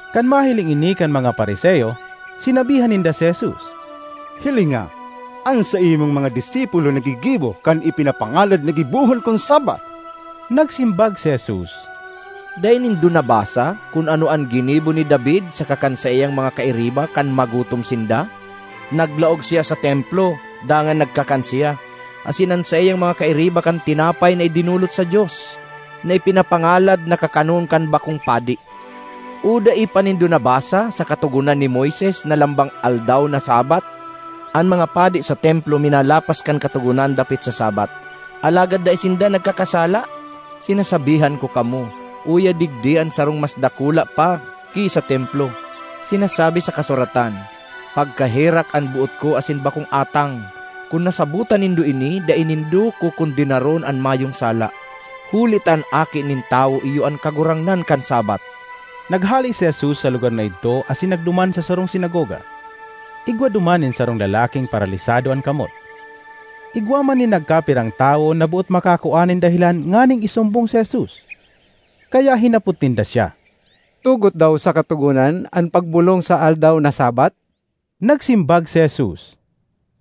Kan mahiling ini kan mga Fariseo, sinabihan ninda si Jesus, “Hilinga, an saimong mga disipulo naggigibo kan ipinapangalad na gibohon kun Sabbath!” Nagsimbag si Jesus, “Dai nindo nabasa kun ano an ginibo ni David saka kan saiyang mga kairiba kan magutom sinda? Naglaog siya sa Templo dangan nagkakan siya asin an saiyang mga kairiba kan tinapay na idinolot sa Dios, na ipinapangalad na kakanon kan bakong padi. O dai pa nindo nabasa sa Katogonan ni Moises na lambang aldaw na Sabbath, an mga padi sa Templo minalapas kan katogonan dapit sa Sabbath, alagad dai sinda nagkakasala? Sinasabihan ko kamo, uya digdi an sarong mas dakula pa ki sa Templo. Sinasabi sa kasuratan, ‘Pagkaherak an boot ko asin bakong atang.’ Kun nasabotan nindo ini, dai nindo kokondenaron an mayong sala. Huli ta an Aki nin Tawo iyo an Kagurangnan kan Sabbath.” Naghale si Jesus sa lugar na idto asin nagduman sa sarong sinagoga. Igwa duman nin sarong lalaking paralisado an kamot. Igwa man nin nagkapirang tawo na boot makakua nin dahelan nganing isumbong si Jesus. Kaya hinapot ninda siya, “Tugot daw sa Katogonan an pagbolong sa aldaw na Sabbath?” Nagsimbag si Jesus,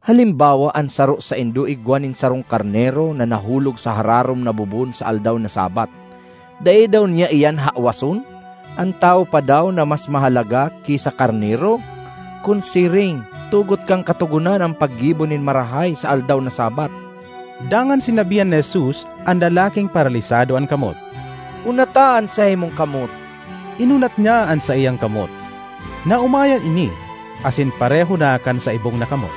“Halimbawa an saro saindo igwa nin sarong karnero na nahulog sa hararom na bobon sa aldaw na Sabbath, dai daw niya iyan hawason? An tawo pa daw na mas mahalaga ki sa karnero! Kun siring, tugot kan Katogonan an paggibo nin marahay sa aldaw na Sabbath.” Dangan sinabihan ni Jesus an lalaking paralisado an kamot, “Unata an saimong kamot.” Inunat niya an saiyang kamot; naomayan ini asin pareho na kan sa ibong na kamot.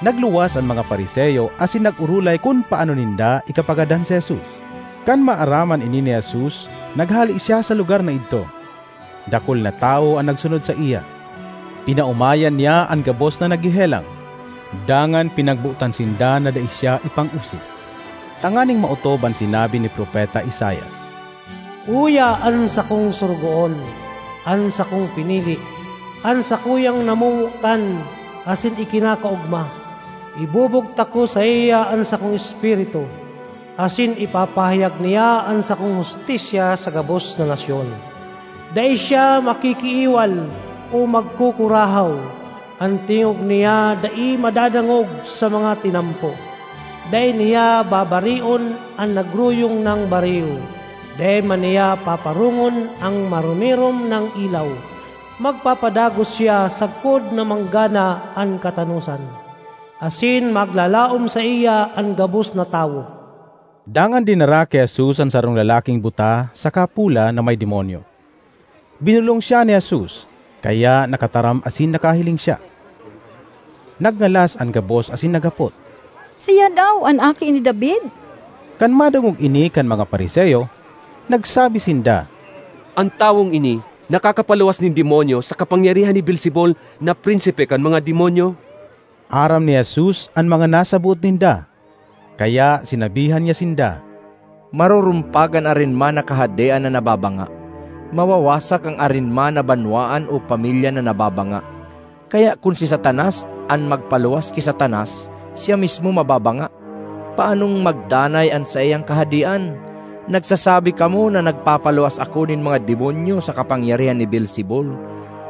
Nagluwas an mga Fariseo asin nag-orolay kun paano ninda ikapagadan si Jesus. Kan maaraman ini ni Jesus, naghale siya sa lugar na idto. Dakul na tawo an nagsunod saiya. Pinaomayan niya an gabos na naghehelang, dangan pinagbotan sinda na dai siya ipangosip, tanganing maotob an sinabi ni propeta Isaias, ”Uya an sakong sorogoon, an sakong pinili, an sakuyang namomotan asin ikinakaogma. Ibubugtak ko saiya an sakong Espiritu, asin ipapahayag niya an sakong hustisya sa gabos na nasyon. Dai siya makikiiwal o magkukurahaw, an tingog niya dai madadangog sa mga tinampo; dai niya babarion an nagruyong nang bariw, dai man niya paparongon an maromirom nang ilaw. Magpapadagos siya sagkod na manggana an katanosan; asin maglalaom saiya an gabos na tawo.” Dangan dinara ki Jesus an sarong lalaking buta saka pola na may demonyo. Binolong siya ni Jesus, kaya nakataram asin nakahiling siya. Nagngalas an gabos asin naghapot, “Siya daw an Aki ni David?” Kan madangog ini kan mga Fariseo, nagsabi sinda, “An tawong ini nakakapaluwas nin demonyo sa kapangyarihan ni Beelzebul na prinsipe kan mga demonyo.” Aram ni Jesus an mga nasa boot ninda, kaya sinabihan niya sinda, “Marurumpag an arin man na kahadean na nababanga; mawawasak an arin man na banwaan o pamilya na nababanga. Kaya kun si Satanas an magpaluwas ki Satanas siya mismo mababanga; paanong magdanay an saiyang kahadean? Nagsasabi kamo na nagpapaluwas ako nin mga demonyo sa kapangyarihan ni Beelzebul.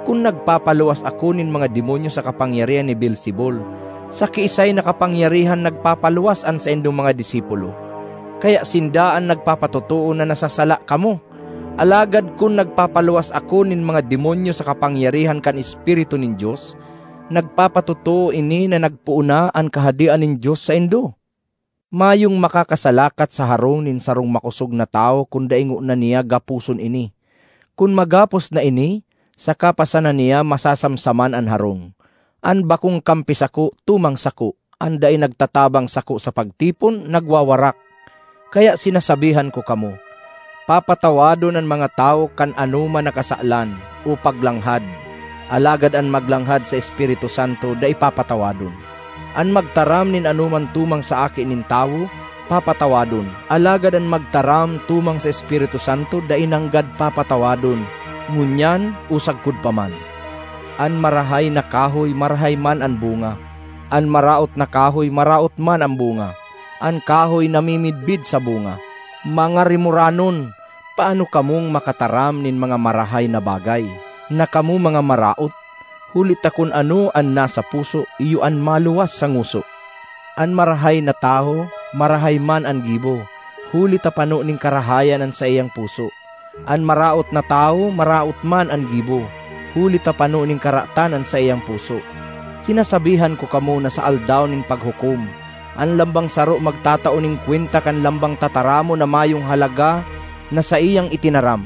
Kun nagpapaluwas ako nin mga demonyo sa kapangyarihan ni Beelzebul, sa kiisay na kapangyarihan nagpapaluwas an saindong mga disipulo? Kaya sinda an nagpapatotoo na nasasala kamo! Alagad kun nagpapaluwas ako nin mga demonyo sa kapangyarihan kan Espiritu nin Dios, nagpapatotoo ini na nagpoon na an Kahadean nin Dios saindo. ”Mayong makakasalakat sa harong nin sarong makosog na tawo kun dai ngona niya gaposon ini. Kun magapos na ini, saka pa sana niya masasamsaman an harong. ”An bakong kampi sako, tumang sako; an dai nagtatabang sako sa pagtipon, nagwawarak. Kaya sinasabihan ko kamo, papatawadon an mga tawo kan ano man na kasalan o paglanghad; alagad an maglanghad sa Espiritu Santo dai papatawadon. An magtaram nin anoman tumang sa Aki nin Tawo, papatawadon; alagad an magtaram tumang sa Espiritu Santo dai nanggad papatawadon—ngunyan o sagkod pa man. ”An marahay na kahoy, marahay man an bunga; an maraot na kahoy, maraot man an bunga. An kahoy namimidbid sa bunga. Mga rimoranon! Paano kamong makataram nin mga marahay na bagay, na kamo mga maraot? Huli ta kun ano an nasa puso iyo an maluwas sa ngoso. An marahay na tawo, marahay man an gibo huli ta pano nin karahayan an saiyang puso; an maraot na tawo, maraot man an gibo huli ta pano nin karatan an saiyang puso. ”Sinasabihan ko kamo na sa Aldaw nin Paghukom an lambang saro magtatao nin kwenta kan lambang tataramon na mayong halaga na saiyang itinaram.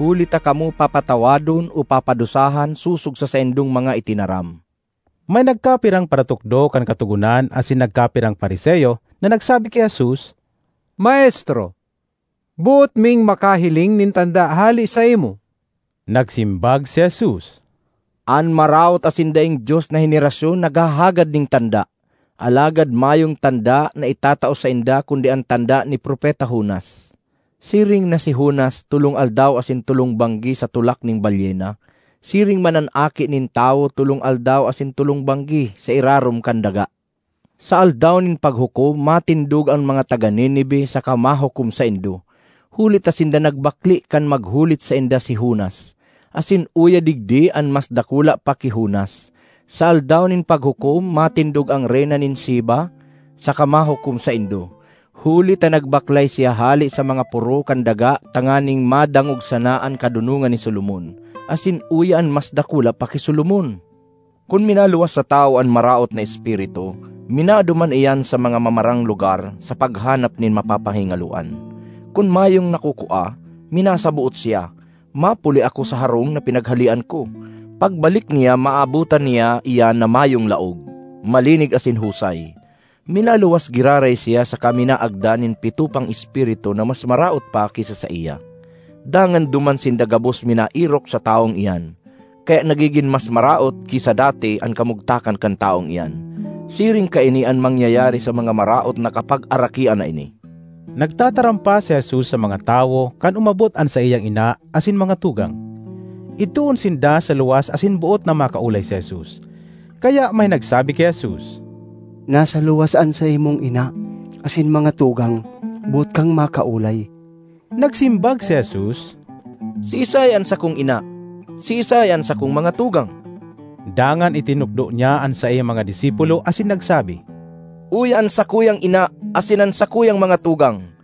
Huli ta kamo papatawadon o papadusahan sosog sa saindong mga itinaram.” May nagkapirang paratukdo kan Katogonan asin nagkapirang Fariseo na nagsabi ki Jesus, “Maestro, boot ming makahiling nin tanda hale saimo.” Nagsimbag si Jesus, “An maraot asin daing Dios na henerasyon naghahagad nin tanda; alagad mayong tanda na itatao sainda kundi an tanda ni Propeta Jonas. Siring na si Jonas tolong aldaw asin tolong banggi sa tulak nin balyena, siring man an Aki nin Tawo tolong aldaw asin tolong banggi sa irarom kan daga. Sa Aldaw nin Paghukom matindog an mga taga Nineve saka mahukom saindo, huli ta sinda nagbakle kan maghulit sainda si Jonas; asin uya digdi an mas dakula pa ki Jonas! Sa Aldaw nin Paghukom matindog an Reyna nin Sheba saka mahukom saindo, huli ta nagbaklay siya hale sa mga poro kan daga tanganing madangog sana an kadonongan ni Solomon; asin uya an mas dakula pa ki Solomon! ”Kun minaluwas sa tawo an maraot na espiritu, minaduman iyan sa mga mamarang lugar sa paghanap nin mapapahingaloan. Kun mayong nakukua, minasaboot siya, ‘Mapuli ako sa harong na pinaghalean ko.’ Pagbalik niya maabotan niya iyan na mayong laog, malinig asin husay. Minaluwas giraray siya saka minaagda nin pito pang espiritu na mas maraot pa ki sa saiya, dangan duman sinda gabos minaerok sa tawong iyan. Kaya nagigin mas maraot ki sa dati an kamugtakan kan tawong iyan. Siring kaini an mangyayari sa mga maraot na kapagarakian na ini.” Nagtataram pa si Jesus sa mga tawo kan umabot an saiyang ina asin mga tugang. Idtoon sinda sa luwas asin boot na makaolay si Jesus. Kaya may nagsabi ki Jesus, “Nasa luwas an saimong ina asin mga tugang, boot kang makaolay.” Nagsimbag si Jesus, “Siisay an sakong ina? Siisay an sakong mga tugang?” Dangan itinukdo niya an saiyang mga disipulo asin nagsabi, “Uya an sakuyang ina asin an sakuyang mga tugang!